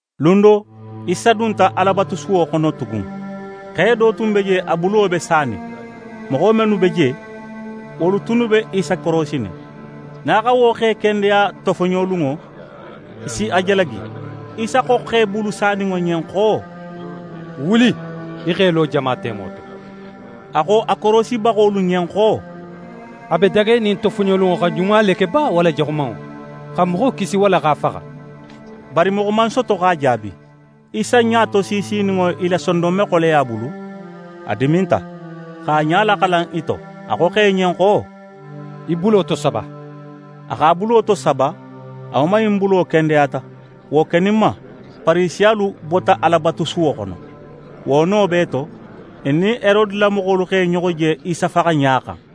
Lun do, Isa dunta Alabatusuwo xono tugun. Xe do tun be je, a bulo be sanin. Moxo mennu be je, wolu tunnu be Isa korosinin. Nin a xa wo xe kendeya tofoɲolunŋo, i si a jalagi. Isa xo xe bulu saninŋo ɲen xo: «Wuli, í x'é lo jama temo to.» A xo a korosibaxolu ɲen xo: «A be dagenin tofoɲolunŋo xa ɲuma le ke ba, walla jaxumanŋo? Xa moxo kisi walla x'a faxa?» Bari moxo man soto x'a jaabi. Isa ɲatosiisininŋo i la sondonmexoleya bulu, a diminta, x'a ɲa laxalan i to. A xo xe ɲen xo: «Í bulo tosaba!» A x'a bulo tosaba. A woman in bulo kendeyata. Wo keninma, Farisiyalu bota Alabatusuwo xono. Wo no bee to, i nin Herode la moxolu x'e ɲoxo je Isa faxaɲa xan.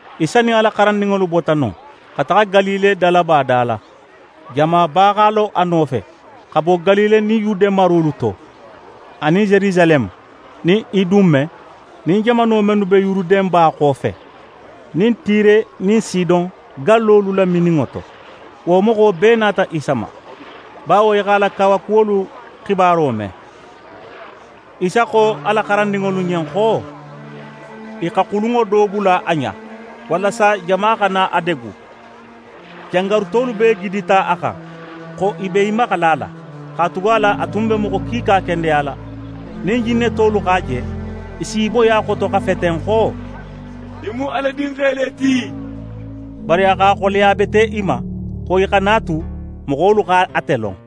Isa nin a la xarandinŋolu bota non, xa taxa Galile dalaba da la. Jamaba x'a lo a nofe, xa bo Galile nin Yude marolu to, anin Yerusaleme nin Idume nin jamano mennu be Yuruden ba xofe, nin Tire nin Sidon gallolu lamininŋo to. Wo moxo bee nata Isa ma, bawo i x'a la kawakuwolu xibaro me. Isa xo a la xarandinŋolu ɲen xo i xa xulunŋo do bula a ɲen, walasa jama xana a degu. Jangarutolu bee gidita a xan, xo i b'e maxala a la; katugala a tun be moxo kiika kendeyala. Nin jinnetolu x'a je, i s'i boyi a xoto, xa feten xo: «Í mu Ala Dinxe le ti.» Bari a x'a xoleya bete i ma, xo i xana a tu, moxolu xa ate lon.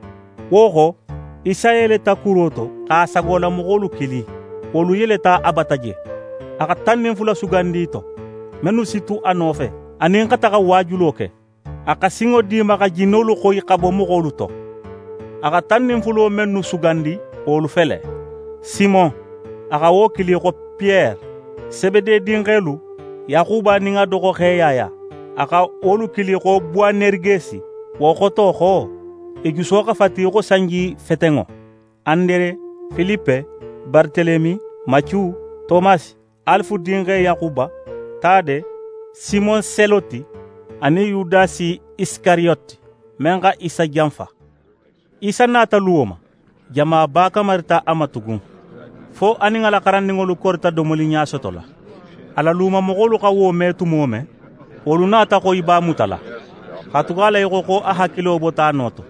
Wo xo, Isa yeleta kuro to, x'a sagolamoxolu kili. Wolu yeleta a bata je. A xa tan nin fula sugandi i to, mennu si tu a nofe, anin xa taxa waajulo ke. A xa sinŋo di i ma, xa jinnolu xoyi, xa bo moxolu to. A xa tan nin fulo mennu sugandi, wolu fele: Simon, a xa wo kili xo Piyere. Sebede dinxelu: Yaxuba nin a doxoxe Yaya. A xa wolu kili xo Bowaneregesi. Wo xoto xo: I juso xa fati í xo sanjifetenŋo. Andere, Filipe, Baratelemi, Macu, Tomasi, Alife dinxe Yaxuba, Tade, Simon Seloti, anin Yudasi Isikariyoti, men xa Isa janfa. Isa nata luwo ma; jamaba kamarita a ma tugun, fo a nin a la xarandinŋolu korita domoli ɲasotola. A la lumamoxolu xa wo me tumo men, wolu nata xo i b'a mutala. Katugala i xo xo a hakilo bota a no to.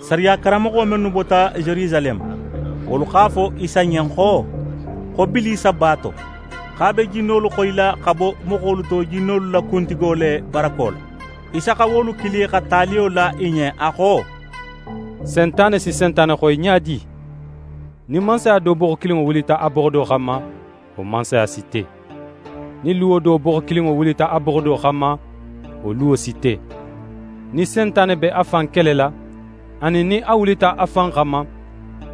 Sariya karanmoxo mennu bota Yerusaleme, wolu x'a fo Isa ɲen xo Bilisa b'a to, xo a be jinnolu xoyila xa bo moxolu to jinnolu la kuntigo le barako la. Isa xa wolu kili xa taliyo la i ɲen, a xo: «Sentane si Sentane xoyi ɲa di? Nin mansaya do boxo kilinŋo wulita a boxo do xanma, wo mansaya si te. Nin luwo do boxo kilinŋo wulita a boxo do xanma, wo luwo si te. Nin Sentane be a fan kelela, anin nin a wulita a fan xanma,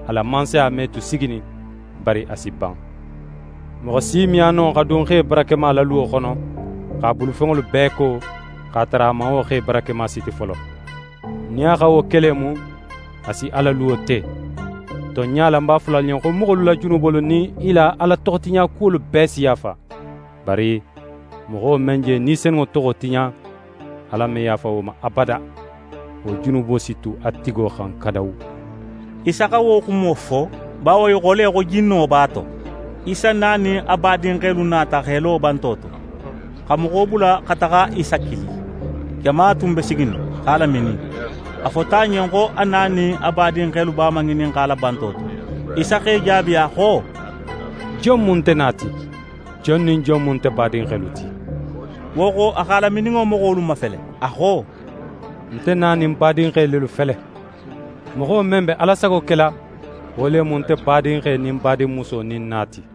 a la mansaya me tu siginin, bari a si ban. «Moxo si me a no xa dun xe barakema la luwo xono, x'a bulufenŋolu bee ko, x'a tara a man wo xe barakema siti folo. Nin a xa wo ke le mu, a si a la luwo te. Tonɲa la, ń b'a fola alu ɲen xo moxolu la junubolu nin i la Ala toxotiɲakuwolu bee si yaafa. Bari moxo men je Ni Senunŋo toxo tiɲa, Ala me yaafa wo ma abada. Wo junubo si tu a tigo xan kadawu.» Isa xa wo xumo fo, bawo i xo le xo jinno b'a to. Isa na nin a badinxelu nata x'e lo banto to, xa moxo bula xa taxa Isa kili. Jama tun be siginin, x'a laminin. A fota a ɲen xo a na nin a badinxelu b'a maŋininxala banto to. Isa x'e jaabi, a xo: «Jon mu nte na ti; jon nin jon mu nte badinxelu ti?» Wo xo, a x'a lamininŋo moxolu mafele, a xo: «Nte na nin ń badinxe lelu fele. Moxo men be Ala sago kela, wo le mu nte badinxe nin ń badinmuso nin ń na ti.»